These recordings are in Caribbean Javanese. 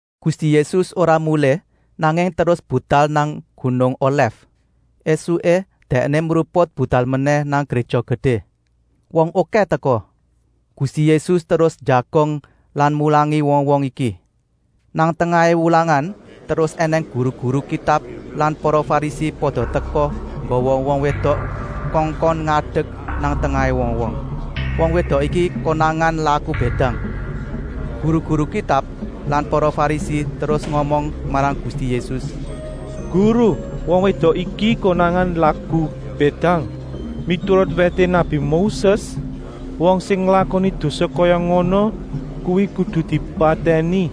Gusti Yésus ora mulih, nanging terus budal nang gunung Olèf. Esuké Dèkné mruput budal menèh nang Gréja Gedé. Wong okèh teka. Gusti Yésus terus njagong lan mulangi wong-wong iki. Nang tengahé wulangan terus ènèng guru-guru Kitab lan wong Farisi pada teka nggawa wong wédok kongkon ngadek nang tengahé wong-wong. Wong wédok iki konangan laku bédang. Guru-guru Kitab lan para Farisi terus ngomong marang Gusti Yésus: “Guru, wong wédok iki konangan laku bédang. Miturut wèté nabi Moses wong sing nglakoni dosa kaya ngono kuwi kudu dipatèni,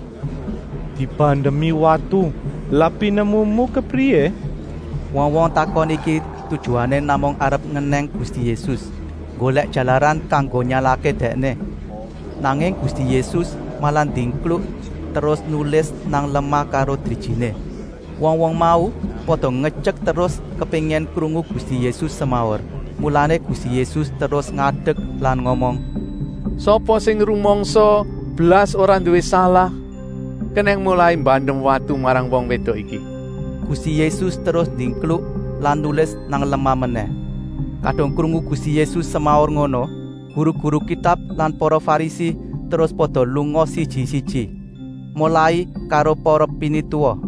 dibandemi watu. Lah pinemumu kepriyé?” Wong-wong takon iki tujuané namung arep ngenèng Gusti Yésus, nggolèk jalaran kanggo nyalahké Dèkné. Nanging Gusti Yésus malah ndingkluk terus nulis nang lemah karo drijiné. Wong-wong mau pada ngetyek terus kepéngin krungu Gusti Yésus semaur, mulané Gusti Yésus terus ngadek lan ngomong: “Sapa sing rumangsa blas ora nduwé salah kenèng molai mbandem watu marang wong wédok iki.” Gusti Yésus terus ndingkluk lan nulis nang lemah menèh. Kadung krungu Gusti Yésus semaur ngono guru-guru Kitab lan para Farisi terus pada lunga siji-siji, molai karo para pinituwa.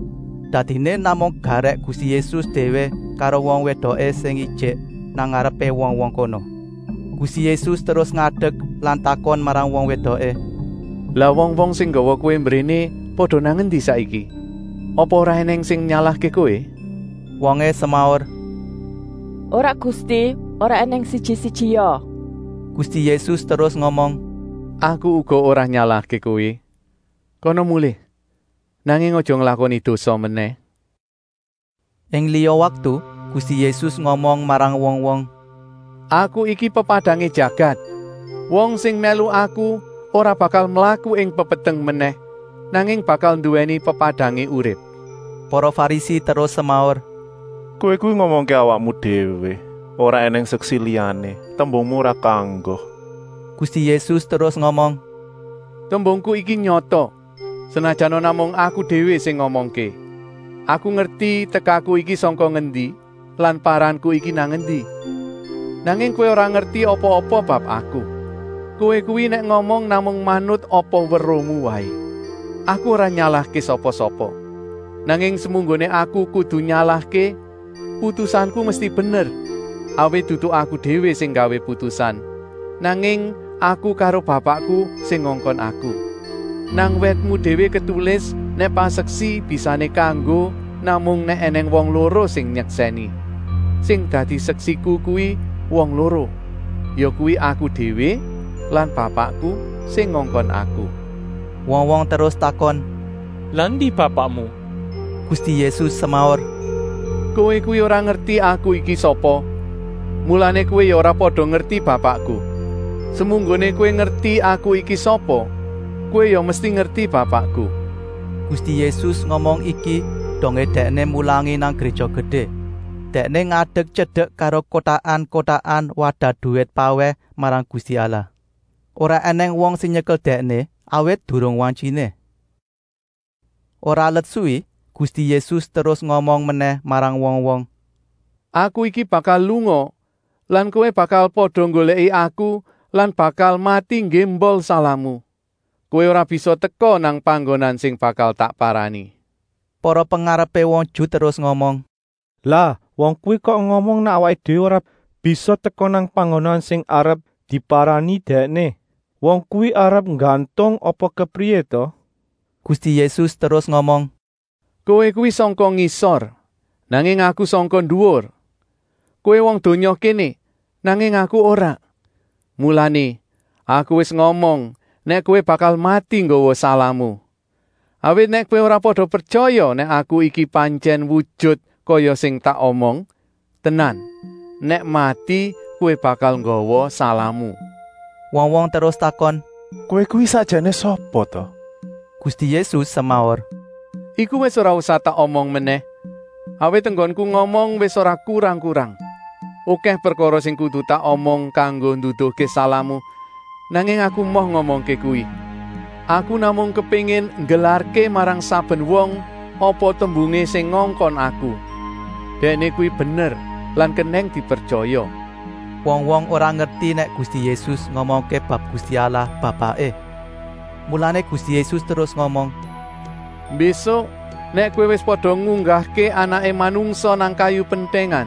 Dadiné namung garèk Gusti Yésus déwé karo wong wédoké sing ijik nang ngarepé wong-wong kono. Gusti Yésus terus ngadek lan takon marang wong wédoké: “Lah wong-wong sing nggawa kowé mbréné pada nang endi saiki? Apa ora ènèng sing nyalahké kowé?” Wongé semaur: “Ora Gusti, ora ènèng siji-sijia!” Gusti Yésus terus ngomong: “Aku uga ora nyalahké kowé, kana mulih, nanging aja nglakoni dosa menèh!” Ing liya waktu Gusti Yésus ngomong marang wong-wong: “Aku iki pepadangé jagat. Wong sing mèlu Aku ora bakal mlaku ing pepeteng menèh, nanging bakal nduwèni pepadangé urip.” Para Farisi terus semaur: “Kowé kuwi ngomongké awakmu déwé, ora ènèng seksi liyané, tembungmu ora kanggo!” Gusti Yésus terus ngomong: “Tembungku iki nyata, senajana namung Aku déwé sing ngomongké. Aku ngerti tekaku iki sangka ngendi lan paranku iki nang endi. Nanging kowé ora ngerti apa-apa bab Aku! Kowé kuwi nèk ngomong namung manut apa weruhmu waé. Aku ora nyalahké sapa-sapa. Nanging semunggoné Aku kudu nyalahké, putusanku mesti bener, awit dudu Aku déwé sing nggawé putusan, nanging Aku karo Bapakku sing ngongkon Aku. Nang wètmu déwé ketulis nèk paseksi bisané kanggo namung nèk ènèng wong loro sing nyeksèni. Sing dadi seksiku kuwi wong loro, yakuwi Aku déwé lan Bapakku, sing ngongkon Aku.” Wong-wong terus takon: “Lah endi Bapakmu.” Gusti Yésus semaur: “Kowé kuwi ora ngerti Aku iki sapa, mulané kowé ya ora pada ngerti Bapakku. Semunggoné kowé ngerti Aku iki sapa, kowé ya mesti ngerti Bapakku!” Gusti Yésus ngomong iki dongé Dèkné mulangi nang Gréja Gedé. Dèkné ngadek tyedek karo kotakan-kotakan wadah duwit pawèh marang Gusti Allah. Ora ènèng wong sing nyekel Dèkné, awit durung wantyiné. Ora let suwi Gusti Yésus terus ngomong menèh marang wong-wong: “Aku iki bakal lunga lan kowé bakal pada nggolèki Aku lan bakal mati nggémbol salahmu. Kowé ora bisa teka nang panggonan sing bakal tak parani.” Para pengarepé wong Ju terus ngomong: “Lah wong kuwi kok ngomong nèk awaké déwé ora bisa teka nang panggonan sing arep diparani Dèkné. Wong kuwi arep nggantung apa kepriyé ta?” Gusti Yésus terus ngomong: “Kowé kuwi sangka ngisor, nanging Aku sangka nduwur. Kowé wong donya kéné, nanging Aku ora. Mulané, Aku wis ngomong nèk kowé bakal mati nggawa salahmu. Awit nèk kowé ora pada pretyaya nèk Aku iki pantyèn wujut kaya sing tak omong, tenan, nèk mati kowé bakal nggawa salahmu.” Wong-wong terus takon: “Kowé kuwi sakjané sapa ta?” Gusti Yésus semaur: “Iku wis ora usah tak omong menèh, awit enggonku ngomong wis ora kurang-kurang. Okèh prekara sing kudu tak omong kanggo nduduhké salahmu, nanging Aku emoh ngomongké kuwi. Aku namung kepéngin nggelarké marang saben wong apa tembungé sing ngongkon Aku. Dèkné kuwi bener lan kenèng dipretyaya.” Wong-wong ora ngerti nèk Gusti Yésus ngomongké bab Gusti Allah, Bapaké. Mulané Gusti Yésus terus ngomong: “Mbésuk nèk kowé wis pada ngunggahké Anaké Manungsa nang kayu pentèngan,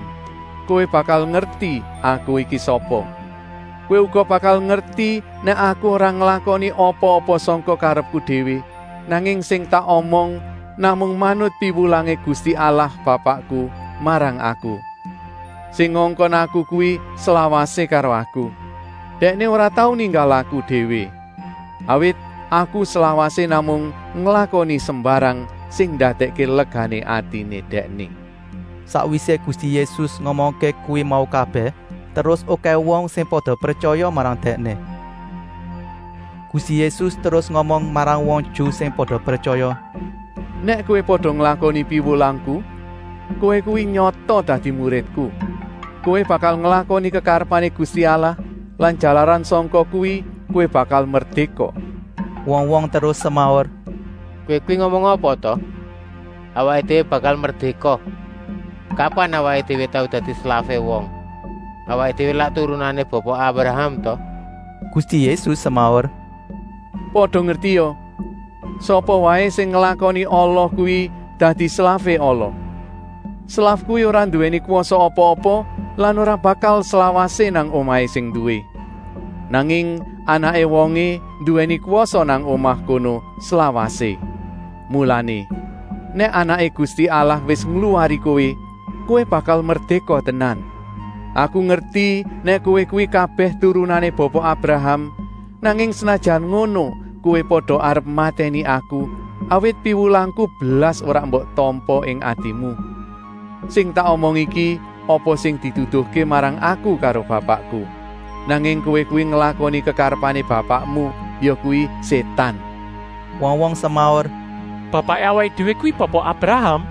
kowé bakal ngerti Aku iki sapa. Kowé uga bakal ngerti nèk Aku ora nglakoni apa-apa sangka karepku déwé, nanging sing tak omong namung manut piwulangé Gusti Allah Bapakku marang Aku. Sing ngongkon Aku kuwi slawasé karo Aku. Dèkné ora tau ninggal Aku déwé, awit Aku slawasé namung nglakoni sembarang sing ndadèkké legané atiné Dèkné.” Sakwisé Gusti Yésus ngomongké kuwi mau kabèh terus okèh wong sing pada pretyaya marang Dèkné. Gusti Yésus terus ngomong marang wong Ju sing pada pretyaya: “Nèk kowé pada nglakoni piwulangku, kowé kuwi nyata dadi muridku. Kowé bakal nglakoni kekarepané Gusti Allah lan jalaran sangka kuwi kowé bakal merdéka.” Wong-wong terus semaur: “Kowé kuwi ngomong apa ta? Awaké déwé bakal merdéka? Kapan awaké déwé tau dadi slafé wong? Awaké déwé lak turunané Bapa Abraham ta?” Gusti Yésus semaur: “Pada ngertia! Sapa waé sing nglakoni ala kuwi dadi slafé ala. Slaf kuwi ora nduwèni kwasa apa-apa lan ora bakal slawasé nang omahé sing nduwé. Nanging anaké wongé nduwèni kwasa nang omah kono slawasé. Mulané, nèk Anaké Gusti Allah wis ngluwari kowé, kowé bakal merdéka tenan. Aku ngerti nèk kowé kuwi kabèh turunané Bapa Abraham, nanging senajan ngono kowé pada arep matèni Aku, awit piwulangku blas ora mbok tampa ing atimu. Sing tak omong iki apa sing diduduhké marang Aku karo Bapakku, nanging kowé kuwi nglakoni kekarepané bapakmu, yakuwi Sétan.” Wong-wong semaur: “Bapaké awaké déwé kuwi Bapa Abraham!”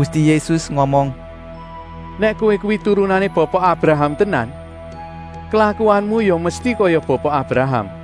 Gusti Yésus ngomong: “Nèk kowé kuwi turunané Bapa Abraham tenan, klakuanmu ya mesti kaya Bapa Abraham!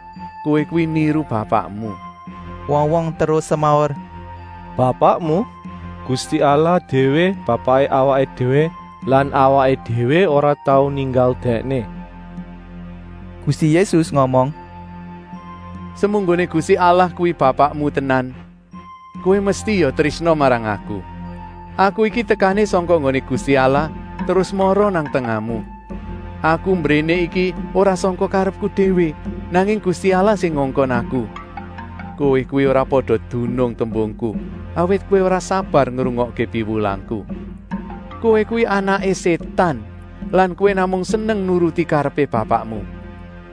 Kowé kuwi niru bapakmu!” Wong-wong terus semaur: “Bapakmu? Gusti Allah déwé bapaké awaké déwé lan awaké déwé ora tau ninggal Dèkné.” Gusti Yésus ngomong: “Semunggoné Gusti Allah kuwi bapakmu tenan, kowé mesti ya trésna marang Aku. Aku iki tekané sangka nggoné Gusti Allah terus mara nang tengahmu. Aku mbréné iki ora sangka karepku déwé, nanging Gusti Allah sing ngongkon Aku. Kowé kuwi ora pada dunung tembungku, awit kowé ora sabar ngrungokké piwulangku! Kowé kuwi anaké Sétan lan kowé namung seneng nuruti karepé bapakmu.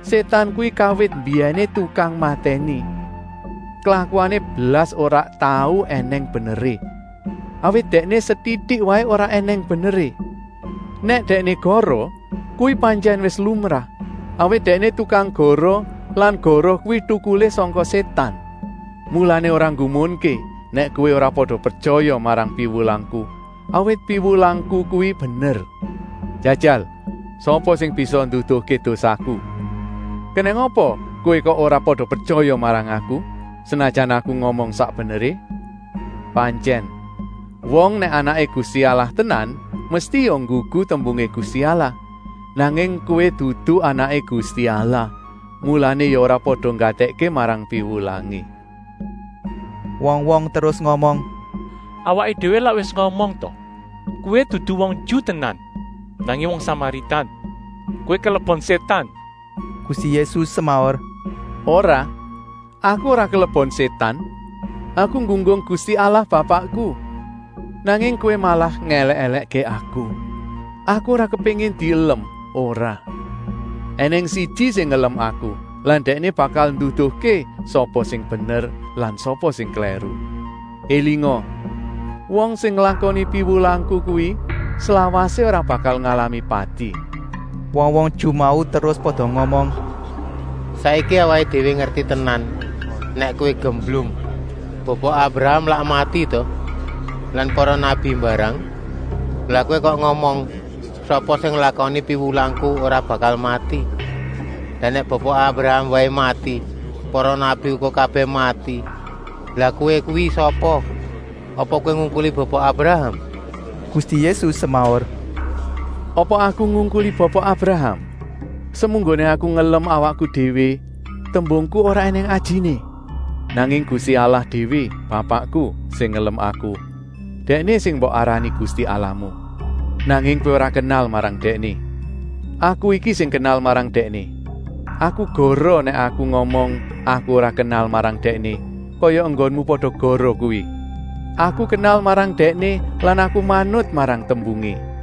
Sétan kuwi kawit mbiyèné tukang matèni. Klakuané blas ora tau ènèng beneré, awit dèkné setitik waé ora ènèng beneré. Nèk dèkné goroh kuwi pantyèn wis lumrah, awit dèkné tukang goroh lan goroh kuwi tukulé sangka Sétan. Mulané ora nggumunké nèk kowé ora pada pretyaya marang piwulangku, awit piwulangku kuwi bener. Jajal, sapa sing bisa nduduhké dosaku? Kenèng apa kowé kok ora pada pretyaya marang Aku, senajana Aku ngomong sak beneré. Pantyèn! Wong nèk anaké Gusti Allah tenan mesti ya nggugu tembungé Gusti Allah. Nanging kowé dudu anaké Gusti Allah, mulané ya ora pada nggatèkké marang piwulangé!” Wong-wong terus ngomong: “Awaké déwé lak wis ngomong ta, kowé dudu wong Ju tenan, nanging wong Samaritan. Kowé kelebon sétan!” Gusti Yésus semaur: “Ora, Aku ora kelebon sétan. Aku nggunggung Gusti Allah Bapakku, nanging kowé malah ngèlèk-èlèkké Aku. Aku ora kepéngin dielem, ora. Enèng siji sing ngelem Aku lan Dèkné bakal nduduhké sapa sing bener lan sapa sing klèru. Elinga! Wong sing nglakoni piwulangku kuwi slawasé ora bakal ngalami pati.” Wong-wong Ju mau terus pada ngomong: “Saiki awaké déwé ngerti tenan nèk kowé gemblung. Bapa Abraham lak mati ta? Lan para nabi mbarang! Lah kowé kok ngomong: ‘Sapa sing nglakoni piwulangku ora bakal mati?’ Lah nèk Bapa Abraham waé mati, para nabi uga kabèh mati, lah kowé kuwi sapa? Apa kowé ngungkuli Bapa Abraham?” Gusti Yésus semaur: “Apa Aku ngungkuli Bapa Abraham? Semunggoné Aku ngelem awakku déwé, tembungku ora ènèng ajiné. Nanging Gusti Allah déwé, Bapakku, sing ngelem Aku. Dèkné sing mbok arani Gusti Allahmu. Nanging kowé ora kenal marang Dèkné. Aku iki sing kenal marang Dèkné. Aku goroh nèk Aku ngomong Aku ora kenal marang Dèkné, kaya enggonmu pada goroh kuwi. Aku kenal marang Dèkné lan Aku manut marang tembungé.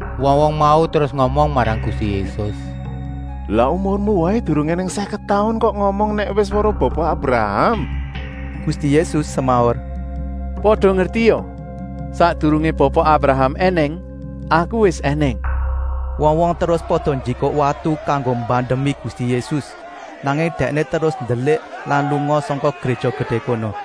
Wong-wong mau terus ngomong marang Gusti Yésus: “Lah umurmu waé durung ènèng sèket taun kok ngomong nèk wis weruh Bapa Abraham?” Gusti Yésus semaur: “Pada ngertia! Sakdurungé Bapa Abraham ènèng Aku wis ènèng.” Wong-wong terus pada njikuk watu kanggo mbandemi Gusti Yésus, nanging Dèkné terus ndelik lan lunga sangka Gréja Gedé kono.